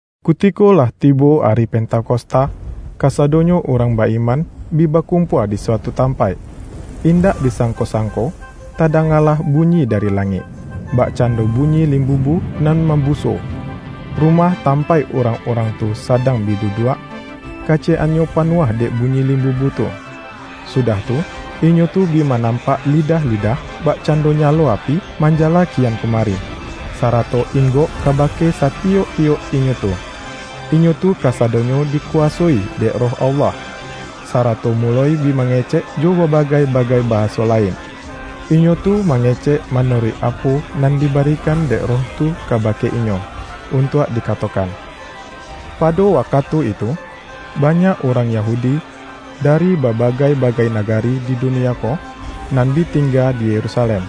Kutiko lah tibo ari Pentakosta, kasadonyo urang ba-iman bi bakumpua di suatu tampaik. Indak disangko-sangko tadangalah bunyi dari langik, bakcando bunyi limbubu nan mambuso. Rumah tampaik urang-urang tu sadang bi duduak, kaciyek-annyo panuah dek bunyi limbubu tu. Sudah tu, inyo tu bi manampak lidah-lidah, bakcando nyalo api, manjala kian kumari, sarato inggok kabake satiyok-tiyok inyo tu. Inyo tu kasadonyo dikuwasoi dek Roh Allah, sarato muloi bi mangecek jo babagai-bagai bahaso lain. Inyo tu mangecek manuruik apo nan dibarikan dek Roh tu kabake inyo, untuak dikatokan. Pado wakatu itu, banyak urang Yahudi, dari babagai-bagai nagari di dunia ko, nan bi tingga di Yerusalem.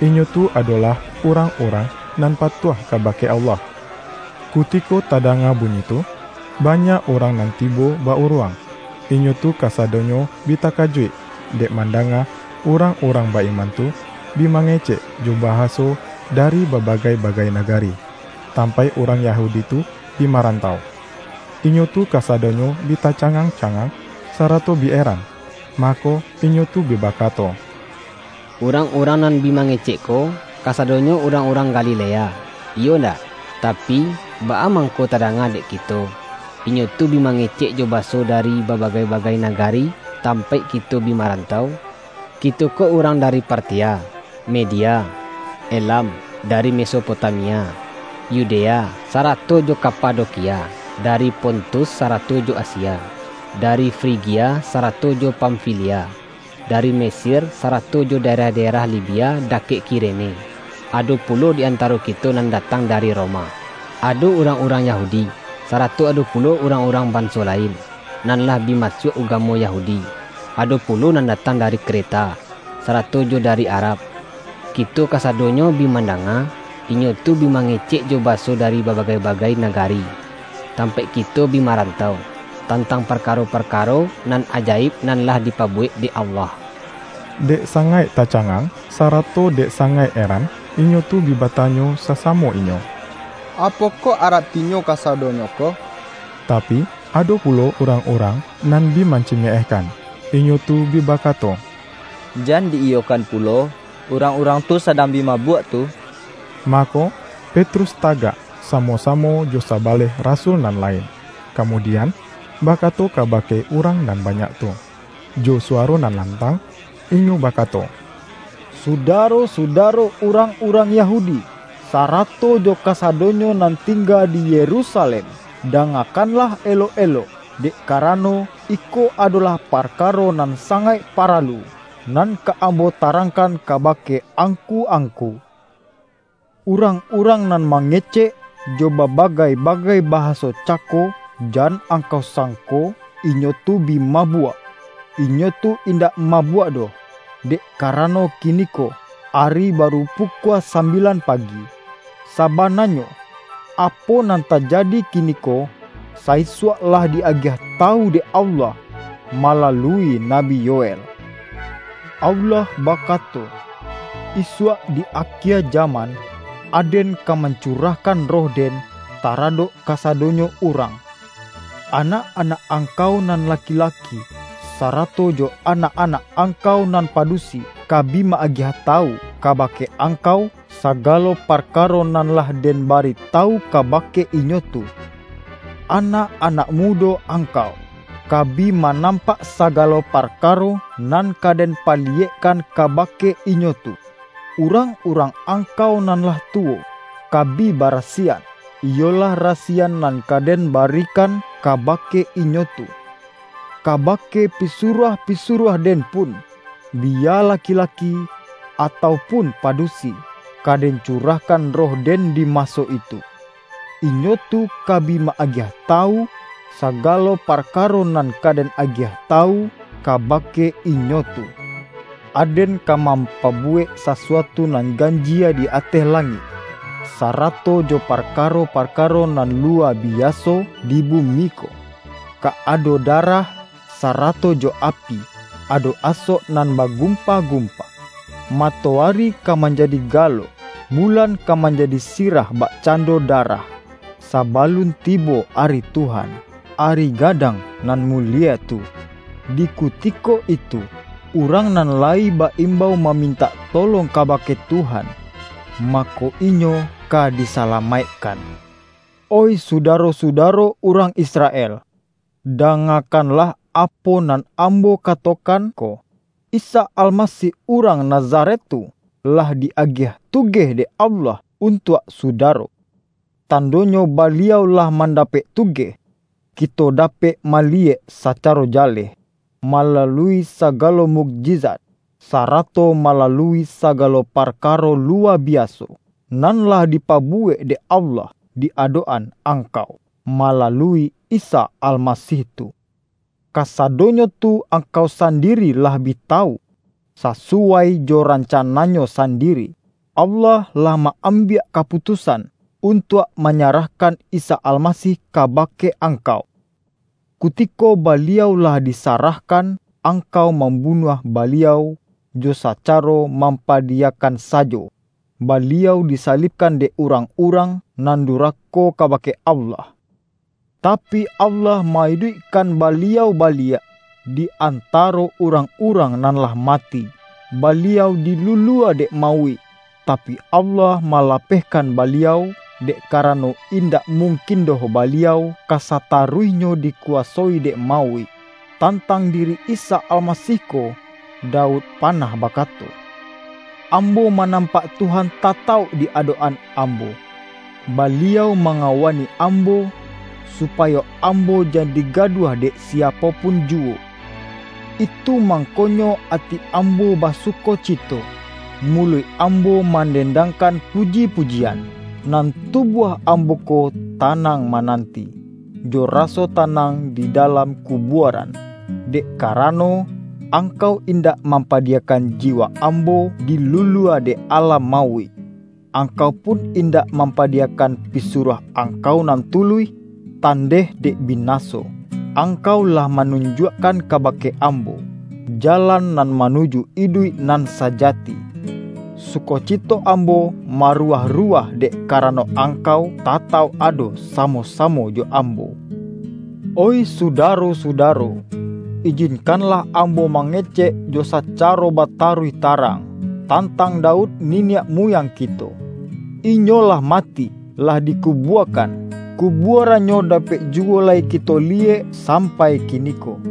Inyo tu adolah urang-urang nan patuah kabake Allah. Kutiko tadanga bunyi tu, banyak urang nan tibo ba-uruang. Inyo tu kasadonyo bi takajuik, dek mandanga urang-urang ba-iman tu, bi mangecek jo bahaso dari babagai-bagai nagari, tampaik urang Yahudi tu bi marantau. Inyo tu kasadonyo bi tacangang-cangang, sarato bi eran, mako, inyo tu bi bakato,”Urang-urang nan bi mangecek ko, kasadonyo urang-urang Galilea, iyo ndak? Tapi, baa mangko tadanga dek kito, inyo tu bi mangecek jo bahaso dari babagai-bagai nagari tampaik kito bi marantau? Kito ko urang dari Partia, Media, Elam; dari Mesopotamia, Yudea sarato jo Kapadokia; dari Pontus sarato jo Asia, dari Frigia sarato jo Pamfilia, dari Mesir sarato jo daerah-daerah Libia dakek Kirene; ado pulo di antaro kito nan datang dari Roma, ado urang-urang Yahudi, sarato ado pulo urang-urang banso lain, nan lah bi masuak ugamo Yahudi; ado pulo nan datang dari Kreta, sarato jo dari Arab. Kito kasadonyo bi mandanga, inyo tu bi mangecek jo bahaso dari babagai-bagai nagari, tampaik kito bi marantau, tantang parkaro-parkaro nan ajaib nan lah dipabuwek dek Allah!” Dek sangaik tacangang, sarato dek sangaik eran, inyo tu bi batanyo sasamo inyo,”Apokoh aratinyo kasadonyo ko?” Tapi, ado pulo urang-urang nan bi mancimeehkan. Inyo tu bi bakato,”Jan di-iyokan pulo, urang-urang tu sadang bi mabuak tu!” Mako, Petrus tagak, samo-samo jo sabaleh rasul nan lain, kamudian, bakato kabake urang nan banyak tu. Jo suwaro nan lantang inyo bakato,”Sudaro-sudaro urang-urang Yahudi, sarato jo kasadonyo nan tingga di Yerusalem! Dangakanlah elok-elok, dek karano, iko adolah parkaro nan sangaik paralu, nan ka ambo tarangkan kabake angku-angku. Urang-urang nan mangecek jo babagai-bagai bahaso cako, jan angkau sangko inyo tu bi mabuak, inyo tu indak mabuak doh; dek karano kiniko, ari baru pukua sambilan pagi. Sabananyo apo nan tajadi kiniko, sa-isuak lah di-agiah tawu dek Allah, malalui Nabi Yoel. Allah bakato, ’Isuak di akie jaman, Aden ka mancurahkan Roh-Den, taradok kasadonyo urang. Anak-anak angkau nan laki-laki, sarato jo anak-anak angkau nan padusi, ka bi ma-agiah tawu kabake angkau, sagalo parkaro nan lah Den baritawu kabake inyo tu. Anak-anak mudo angkau, ka bi manampak sagalo parkaro, nan ka Den paliyekkan kabake inyo tu. Urang-urang angkau nan lah tuwo, ka bi barasiyan, iyolah rasiyan nan ka Den barikan kabake inyo tu. Kabake pisuruah-pisuruah-Den pun — biya laki-laki atau pun padusi —, ka Den curahkan Roh-Den di maso itu. Inyo tu ka bi ma-agiah tawu, sagalo parkaro nan ka Den agiah tawu kabake inyo tu. Aden ka mampabuwek sasuatu nan ganjie di ateh langik, sarato jo parkaro-parkaro nan luwa biaso di bumi ko; ka ado darah, sarato jo api, ado asok nan bagumpa-gumpa. Matoari ka manjadi galok, bulan ka manjadi sirah bakcando darah, sabalun tibo Ari Tuhan, ari gadang nan mulie tu. Di kutiko itu, urang nan lai ba-imbau mamintak tolong kabake Tuhan, mako, inyo ka disalamaikkan.’ Oih sudaro-sudaro urang Israel! Dangakanlah apo nan ambo katokan ko. Isa Almasih urang Nazaret tu, lah di-agiah tugeh dek Allah untuak sudaro. Tandonyo Baliau lah mandapek tugeh, kito dapek maliyek sacaro jaleh, malalui sagalo mukjizat, sarato malalui sagalo parkaro luwa biaso, nan lah dipabuwek dek Allah di adok-an angkau, malalui Isa Almasih tu. Kasadonyo tu angkau sandiri lah bi tawu. Sasuwai jo rancana-Nyo sandiri, Allah lah ma-ambiak kaputusan untuak manyarahkan Isa Almasih kabake angkau. Kutiko Baliau lah disarahkan, angkau mambunuah Baliau, jo sacaro mampadiyakan sajo, Baliau disalibkan dek urang-urang nan durako kabake Allah. Tapi Allah ma-iduikkan Baliau baliak, di antaro urang-urang nan lah mati. Baliau dilulua dek mauik, tapi, Allah malapehkan Baliau, dek karano indak mungkin doh Baliau ka sataruihnyo dikuwasoi dek mauik. Tantang diri Isa Almasih ko, Daud panah bakato, ’Ambo manampak Tuhan tatauk di adok-an ambo; Baliau mangawani ambo, supayo ambo jan digaduah dek siapo pun juwo. Itu mangkonyo ati ambo basukocito, muluik ambo mandendangkan puji-pujian: nan tubuah ambo ko tanang mananti, jo raso tanang di dalam kubuaran. Dek karano, Angkau indak mampadiyakan jiwa ambo dilulua dek alam mauik. Angkau pun indak mampadiyakan pisuruah Angkau nan tuluih, tandeh dek binaso. Angkau lah manunjuakkan kabake ambo, jalan nan manuju iduik nan sajati. Sukocito ambo maruwah-ruwah dek karano Angkau tatauk ado samo-samo jo ambo.’ Oih sudaro-sudaro, ijinkanlah ambo mangecek jo sacaro bataruih tarang, tantang Daud niniak muyang kito. Inyo lah mati, lah dikubuakan; kubuarannyo dapek juwo lai kito liyek sampai kiniko.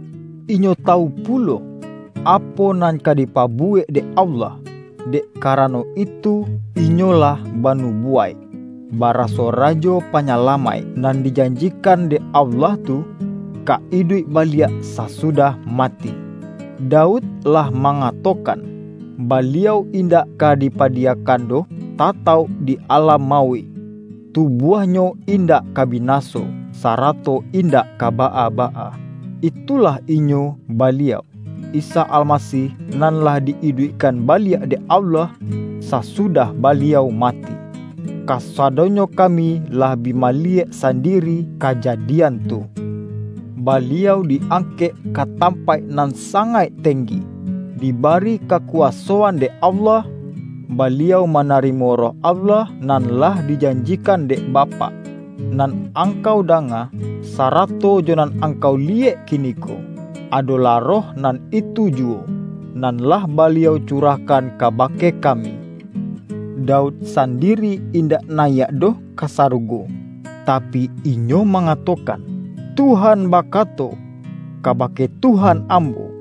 inyo tawu pulo apo nan ka dipabuwek dek Allah. Dek karano itu inyo lah banubuwaik, baraso Rajo Panyalamaik nan dijanjikan dek Allah tu, ka iduik baliak sasudah mati. Daud lah mangatokan, ’Baliau indak ka dipadiyakan doh tatauk di alam mauik; tubuah-Nyo indak ka binaso, sarato indak ka baa-baa.’ Itulah Inyo Baliau, Isa Almasih nan lah di-iduikkan baliak dek Allah, sasudah Baliau mati. Kasadonyo kami lah bi maliyek sandiri kajadian tu. Baliau di-angkek ka tampaik nan sangaik tenggi, dibari kakuwasoan dek Allah, Baliau manarimo Roh Allah nan lah dijanjikan dek Bapak. Nan angkau danga, sarato jo nan angkau liyek kiniko, adolah Roh nan itu juwo, nan lah Baliau curahkan kabake kami. Daud sandiri indak nayiak doh ka sarugo, tapi, inyo mangatokan, ’Tuhan bakato, kabake Tuhan ambo: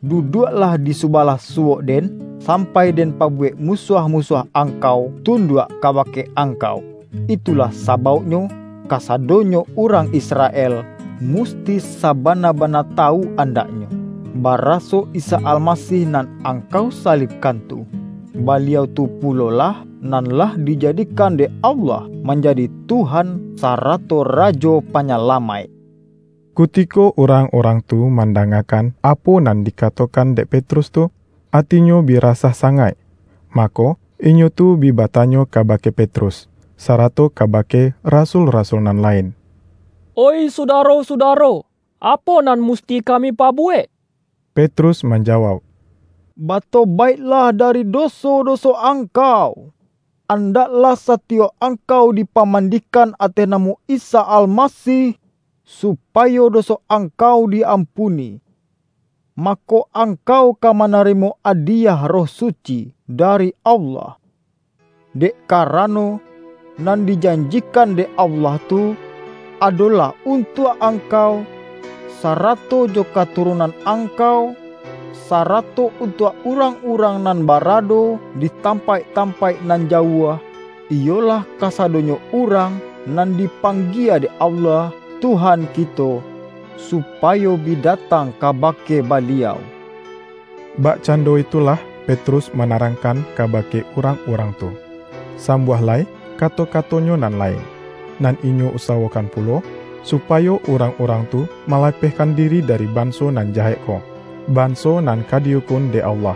Duduaklah di subalah suwok Den, sampai Den pabuwek musuah-musuah Angkau tunduak kabake Angkau!' Itulah sabauknyo, kasadonyo urang Israel musti sabana-bana tawu andaknyo, baraso Isa Almasih nan angkau salibkan tu, Baliau tu pulolah nan lah dijadikan dek Allah, manjadi Tuhan sarato Rajo Panyalamaik!” Kutiko urang-urang tu man-dangakan apo nan dikatokan dek Petrus tu, atinyo bi rasah sangaik. Mako, inyo tu bi batanyo kabake Petrus, sarato kabake rasul-rasul nan lain,”Oih sudaro-sudaro, apo nan musti kami pabuwek?” Petrus manjawauk,”Batobaiklah dari doso-doso angkau. Andaklah satiyok angkau dipamandikan ateh namo Isa Almasih, supayo doso angkau di-ampuni. Mako, angkau ka manarimo adiyah Roh Suci dari Allah. Dek karano, nan dijanjikan dek Allah tu, adolah untuak angkau, sarato jo katurunan angkau, sarato untuak urang-urang nan barado di tampaik-tampaik nan jauah — iyolah kasadonyo urang nan dipanggie dek Allah Tuhan kito, supayo bi datang kabake Baliau.” Bakcando itulah Petrus mana-rangkan kabake urang-urang tu. Sambuah lai kato-katonyo nan lain, nan inyo usawokan pulo, supayo urang-urang tu malapehkan diri dari banso nan jahek ko, banso nan ka di-ukun dek Allah.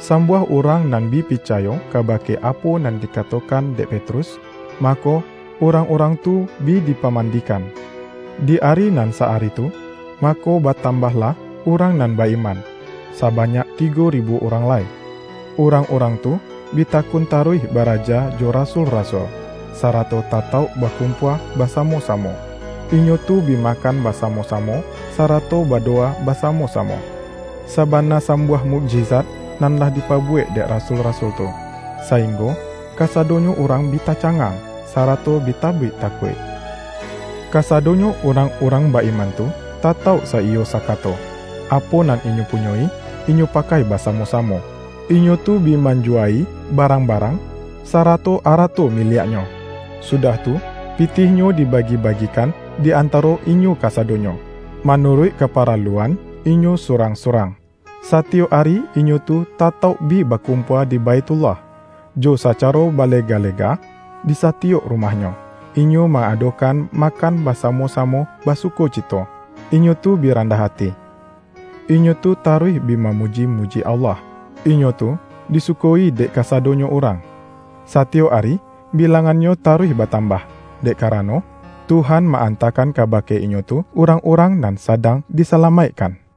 Sambuah urang nan bi picayo kabake apo nan dikatokan dek Petrus, mako, urang-urang tu bi dipamandikan. Di ari nan sa-ari tu, mako batambahlah urang nan ba-iman, sabanyak tigo ribu urang lai. Urang-urang tu bi takun taruih baraja jo rasul-rasul, sarato tatauk bakumpua basamo-samo. Inyo tu bi makan basamo-samo, sarato badowa basamo-samo. Sabana sambuah mukjizat nan lah dipabuwek dek rasul-rasul tu, sainggo kasadonyo urang bi tacangang, sarato bi tabik takuik. Kasadonyo urang-urang ba-iman tu tatauk saiyo sakato, apo nan inyo punyoi, inyo pakai basamo-samo. Inyo tu bi manjuwa-i barangbarang, sarato arato miliaknyo, sudah tu pitihnyo dibagi-bagikan di antaro inyo kasadonyo, manuruik kaparaluan inyo surang-surang. Satiyok ari inyo tu tatauk bi bakumpua di Baithullah; jo sacaro balega-lega disatiyok rumahnyo, inyo ma-adokan makan basamo-samo basukocito, inyo tu bi randah ati. Inyo tu taruih bi mamuji-muji Allah, inyo tu disuko-i dek kasadonyo urang. Satiyok ari bilangannyo taruih batambah, dek karano, Tuhan ma-antakan kabake inyo tu urang-urang nan sadang disalamaikkan. RIWAYAIK RASUL-RASUL